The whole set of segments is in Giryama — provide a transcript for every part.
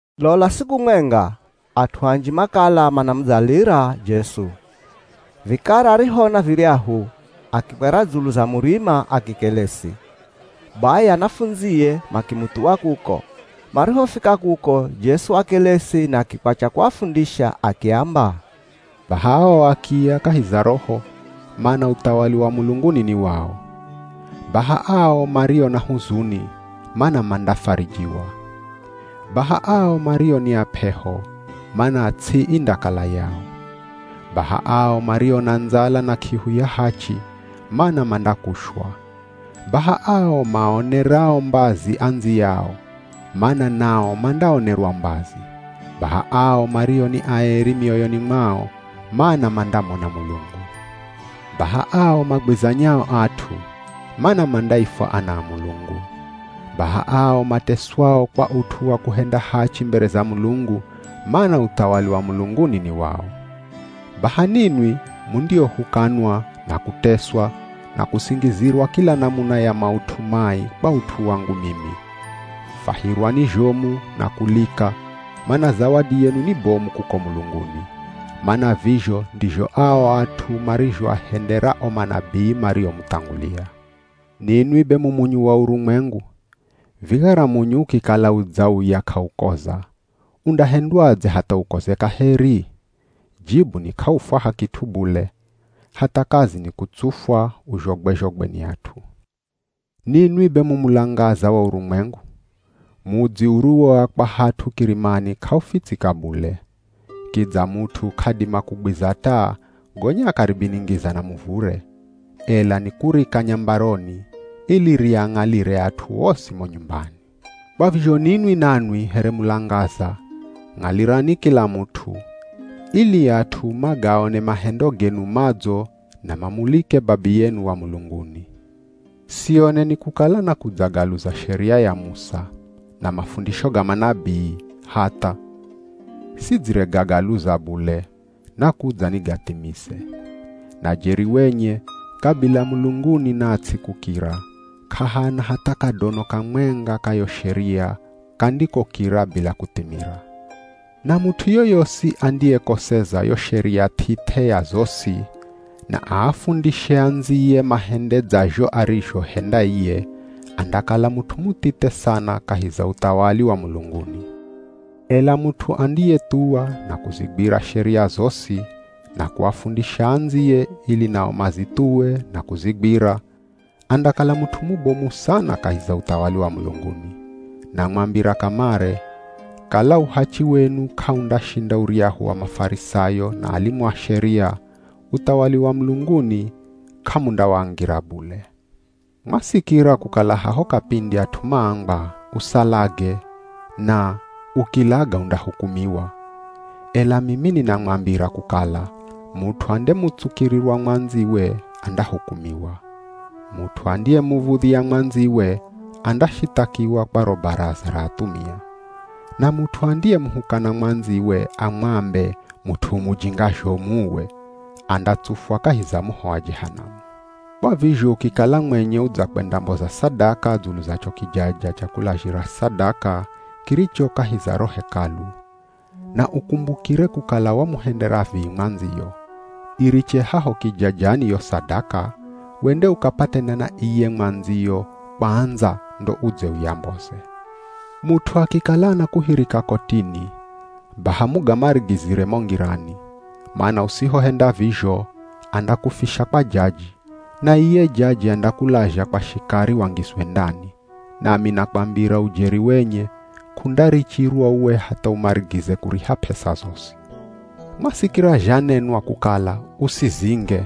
Lola siku mwenga, at'u anji makala manamudzalira Jesu. Vikara arihoona viryahu, akikwera dzulu za murima akikelesi. Bai anafundzie makimuthuwa kuko. Marihofika kuko Jesu wakelesi na akikwatya kuafundisha akiamba, “Baha ao akiya kahi za roho, mana uthawali wa mulunguni ni wao. Baha ao mario na huzuni, mana mandafarijiwa. Baha ao mario ni ap'eho, mana ts'i indakala yao. Baha ao mario na ndzala na k'ihu ya hachi, mana mandakushwa. Baha ao maaonerao mbazi andziyao, mana nao mandaonerwa mbazi. Baha ao mario ni aeri mioyoni mwao, mana mandamona Mulungu. Baha ao magwizanyao at'u, mana mandaifwa ana a Mulungu. Baha ao mateswao kwa ut'u wa kuhenda hachi mbere za Mulungu, mana uthawali wa mulunguni ni wao. Baha ninwi mundiohukanwa, na kuteswa, na kusingizirwa kila namuna ya maut'u mai kwa ut'u wangu mimi. Fwahirwani zhomu na kulika, mana zawadi yenu ni bomu kuko mulunguni. Mana vizho ndizho ao at'u marizhoahendera o manabii mariomuthangulia.” “Ninwi be mu munyu wa urumwengu. Vikara munyu ukikala udzauya k'aukoza, undahendwadze hatha ukoze kaheri? Jibu ni k'aufwaha kit'u bule, hatha kazi ni kutsufwa uzhogwe-zhogwe ni at'u. Ninwi be mu mulangaza wa urumwengu. Mudzi uriwoakwa hat'u kirimani k'aufitsika bule. Kidza mut'u k'adima kugwiza taa gonya akaribiningiza na muvure, ela nikurika nyambaroni, ili riang'alire at'u osi mo nyumbani. Kwa vizho ninwi nanwi here mulangaza, ng'alirani kila mut'u, ili at'u magaone mahendo genu madzo na mamulike Babiyenu wa mulunguni.” “Sioneni kukala nakudzagaluza Sheria ya Musa, na mafundisho ga manabii, hatha! Sidziregagaluza bule, nakudza nigathimize. Na jeri wenye, kabila mulunguni na ts'i kukira, k'ahana hatha kadono kamwenga ka yo Sheria kandikokira bila kuthimira. Na mut'u yoyosi andiyekoseza yo Sheria th'ith'e ya zosi, na aafundishe andziye mahende dzazho arizhohenda iye, andakala mut'u muthithe sana kahi za uthawali wa mulunguni. Ela mut'u andiyethuwa na kuzigwira sheria zosi, na kuafundisha andziye ili nao mazithuwe na kuzigwira, andakala mut'u mubomu sana kahi za uthawali wa mulunguni. Namwambira kamare, kala uhachi wenu k'aundashinda uryahu wa Mafarisayo na alimu a Sheria, uthawali wa mulunguni k'amundawangira bule.” “Mwasikira kukala haho kapindi at'u maambwa, ‘Usalage’ na ‘Ukilaga undahukumiwa.’ Ela mimi ninamwambira kukala, mut'u andemutsukirirwa mwandziwe andahukumiwa. Mut'u andiyemuv̱udhya mwandziwe andashithakiwa kwa ro Baraza ra athumia. Na mut'u andiyemuhukana mwandziwe amwambe, ‘Mut'u u mujinga zhomu uwe!’ andatsufwa kahi za moho wa Jehanamu. Kwa vizho ukikala mwenye udzakwendamboza sadaka dzulu za cho kijaja cha kulazhira sadaka kiricho kahi za ro Hekalu, na ukumbukire kukala wamuhendera vii mwandziyo, iriche haho kijajani yo sadaka, wende ukapatane na iye mwandziyo kwandza ndo udze uyamboze. Mut'u akikala anakuhirika kotini, baha mugamarigizire mo ngirani, mana usihohenda vizho, andakufisha kwa jaji, na iye jaji andakulazha kwa shikari wangizwe ndani. Nami nakwambira ujeri wenye, k'undarichirwa uwe hatha umarigize kuriha p'esa zosi.” “Mwasikira zhanenwa kukala, ‘Usizinge.’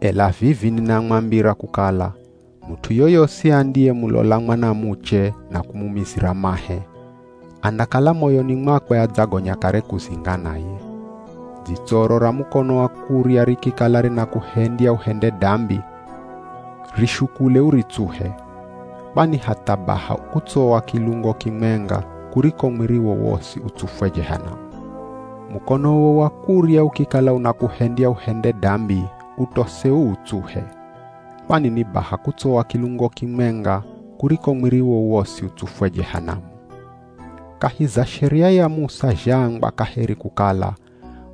Ela vivi ninamwambira kukala, mut'u yoyosi andiyemulola mwanamuche na kumumizira mahe, andakala moyoni mwakwe adzagonya kare kuzinga naye. Dzitsoro ra mukono wa kurya rikikala rinakuhendya uhende dambi, rishukule uritsuhe. Kwani hatha baha kutsowa kilungo kimwenga kuriko mwiriwo wosi utsufwe Jehanamu. Mukonowo wa kurya, ukikala unakuhendya uhende dambi utose uutsuhe. Kwani ni baha kutsowa kilungo kimwenga kuriko mwiriwo wosi utsufwe Jehanamu.” “Kahi za Sheria ya Musa zhaambwa kaheri kukala,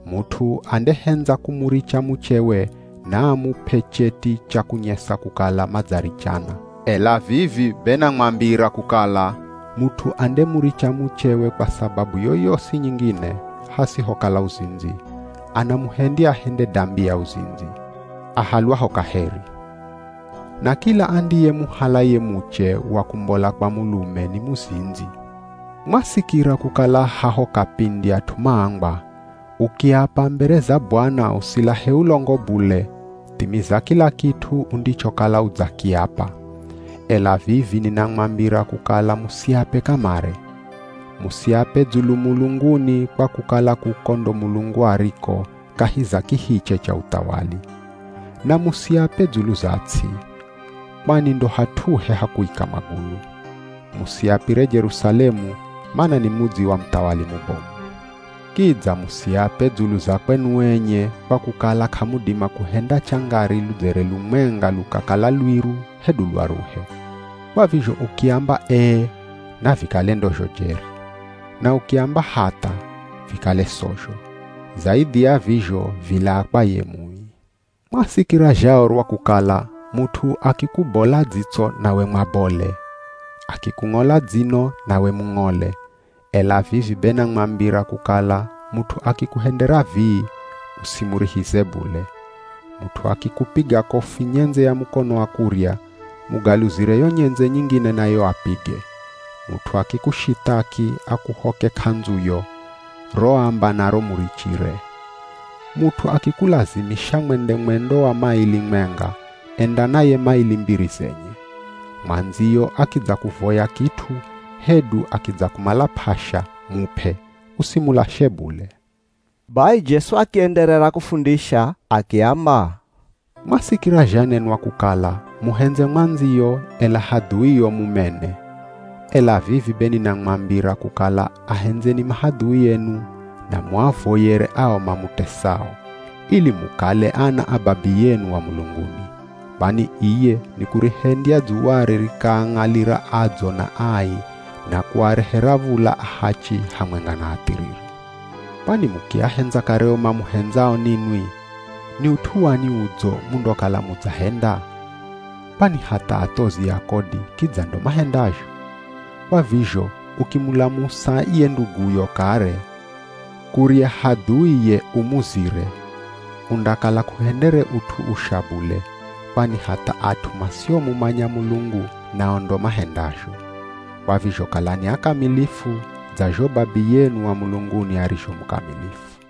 ‘Mut'u andehendza kumuricha muchewe naamup'e cheti cha kunyesa kukala madzarichana.’ “Ela vivi be namwambira kukala, mut'u andemuricha muchewe kwa sababu yoyosi nyingine, hasihokala uzindzi, anamuhendya ahende dambi ya uzindzi, ahalwaho kaheri. Na kila andiyemuhala ye muche wa kumbola kwa mulume ni muzindzi.” “Mwasikira kukala haho kapindi at'u maambwa, ‘Ukiapa mbere za Bwana usilahe ulongo bule, thimiza kila kit'u undichokala udzakiapa.’ Ela vivi ninamwambira kukala musiape kamare. Musiape dzulu mulunguni kwa kukala kuko ndo Mulungu ariko, kahi za kihiche cha uthawali. Na musiape dzulu za ts'i, kwani ndo hat'uhe ha kuika magulu. Musiapire Jerusalemu, mana ni mudzi wa muthawali mubomu. Kidza musiape dzulu za kwenu enye kwa kukala k'amudima kuhenda changari ludzere lumwenga lukakala lwiru hedu lwaruhe. Kwa vizho ukiamba, ‘Ee,’ navikale ndozho jeri. Na ukiamba, ‘Hatha,’ vikale sozho. Zaidhi ya vizho vilaa kwa ye Mui.” “Mwasikira zhaorwa kukala, ‘Mut'u akikubola dzitso nawe mwabole. Akikung'ola dzino nawe mung'ole.’ Ela vivi be namwambira kukala mut'u akikuhendera vii, usimurihize bule. Mut'u akikupiga kofi nyendze ya mukono wa kurya, mugaluzire yo nyendze nyingine nayo apige. Mut'u akikushithaki akuhoke k'andzuyo, ro amba naro murichire. Mut'u akikulazimisha mwende mwendo wa maili mwenga, enda naye maili mbiri zenye. Mwandziyo akidzakuvoya kit'u hedu akidzakumala p'asha, mup'e, usimulashe bule.” Bai Jesu akienderera kufundisha akiamba, “Mwasikira zhanenwa kukala, ‘Muhendze mwandziyo, ela hadhuio mumene.’ Ela vivi be ninamwambira kukala ahendzeni mahadhui enu, na muavoyere ao mamutesao, ili mukale ana a Babiyenu wa mulunguni. Kwani, iye nikurihendya dzuware rikaang'alira adzo na ai na kuarehera v̱ula ahachi hamwenga na athiriri. Kwani mukiahendza kare o mamuhendzao ninwi, ni ut'u wani udzo mundokala mudzahenda? Kwani hatha athozi a kodi kidza ndo mahendazho. Kwa vizho ukimulamusa ye nduguyo kare, kurya hadhui ye umuzire, undakala k'uhendere ut'u usha bule, kwani hatha at'u masiomumanya Mulungu nao ndo mahendazho. Kwa vizho kalani akamilifu, dza zho Babiyenu wa mulunguni arizho mukamilifu.”